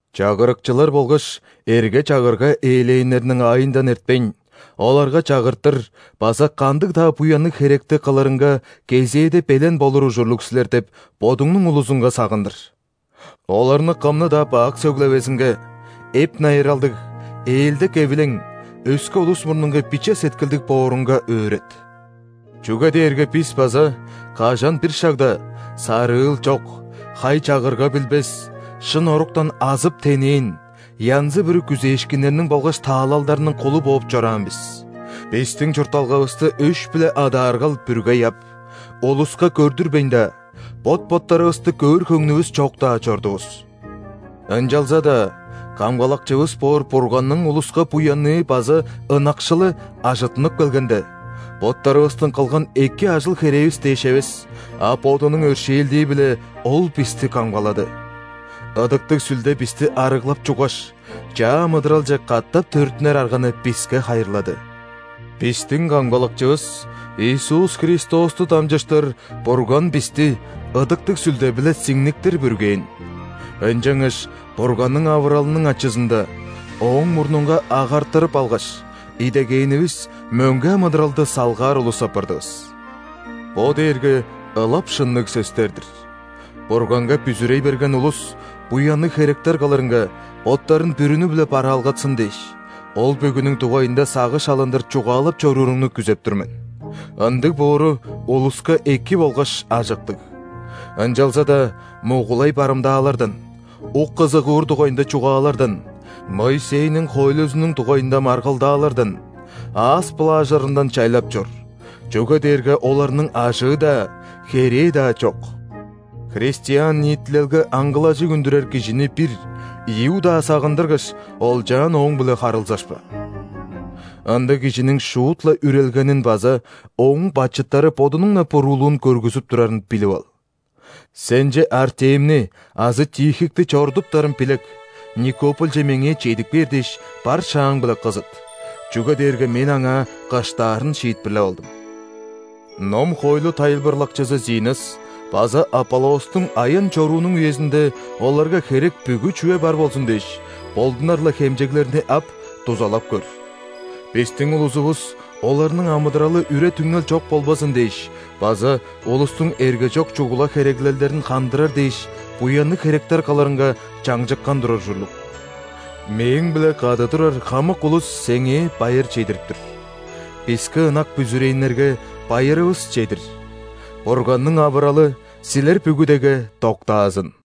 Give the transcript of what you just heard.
«Чагырыкчылар болгаш эрге-чагырга ээлээннерниң аайындан эртпейн, оларга чагыртыр база кандыг-даа буянныг херекти кылырынга кезээде белен болур ужурлуг силер» деп, бодуңнуң улузуңга сагындыр. Оларны кымны-даа бак сөглевезинге, эп-найыралдыг, ээлдек-эвилең, өске улус мурнунга биче сеткилдиг боорунга өөрет. Чүге дээрге бис база кажан-бир шагда сарыыл чок, хай-чагырга билбес, шын оруктан азып-тенээн, янзы-бүрү күзээшкиннерниң болгаш таалалдарның кулу бооп чораан бис. Бистиң чуртталгавысты өш биле адааргал бүргей ап, улуска көрдүрбейн-даа, бот-боттарывысты көөр хөңнүвүс чок-даа чордувус. Ынчалза-даа Камгалакчывыс боор Бурганның улуска буянныы база ынакшылы ажыттынып келгенде, боттарывыстың кылган эки ажыл-херээвис дээш эвес, а Бодунуң өршээлдии-биле Ол бисти камгалады. Ыдыктыг Сүлде бисти арыглап чуггаш, чаа амыдыралче катап төрүттүнер арганы биске хайырлады. Бистиң Камгалакчывыс Иисус Христосту дамчыштыр Бурган бисти Ыдыктыг Сүлде-биле сиңниктир бүргээн. Ынчангаш Бурганның авыралының ачызында Ооң мурнунга агартырып алгаш, идегээнивис мөңге амыдыралды салгаар улус апардывыс. Бо дээрге ылап шынныг сөстер-дир. Бурганга бүзүрей берген улус буянныг херектер кылырынга боттарын бүрүнү-биле бараалгатсын дээш, ол бүгүнүң дугайында сагыш алындыр чугаалап чорууруңну күзеп тур мен. Ындыг боору – улуска эки болгаш ажыктыг. Ынчалза-даа мугулай барымдаалардан, ук-ызыгуур дугайында чугаалардан, Моисейниң хоойлузунуң дугайында маргылдаалардан, аас былаажырындан чайлап чор, чүге дээрге оларның ажыы-даа, херээ-даа чок. Христиан ниитилелге аңгылажыг үндүрер кижини бир, ийи удаа сагындыргаш, олчаан ооң-биле харылзашпа. Ындыг кижиниң шуут-ла үрелгенин база ооң бачыттары бодунуң-на буруулуун көргүзүп турарын билип ал. Сенче Артемни азы Тихикти чорудуптарым билек, Никопольче меңээ чедип кээр дээш, бар шааң-биле кызыт, чүге дээрге мен аңаа кыштаарын шиитпирлеп алдым. Ном-хоойлу тайылбырлакчызы Зинас база Аполлостуң аян-чоруунуң үезинде оларга херек бүгү чүве бар болзун дээш, болдунар-ла хемчеглерни ап, дузалап көр. Бистиң улузувус оларның амыдыралы үре-түңнел чок болбазын дээш база улустуң эргежок чугула хереглелдерин хандырар дээш, буянныг херектер кылырынга чаңчыккан турар ужурлуг. Мээң-биле кады турар хамык улус сеңээ байыр чедирип тур. Биске ынак бүзүрээннерге байырывыс чедир. Бурганның авыралы силер бүгүдеге доктаазын!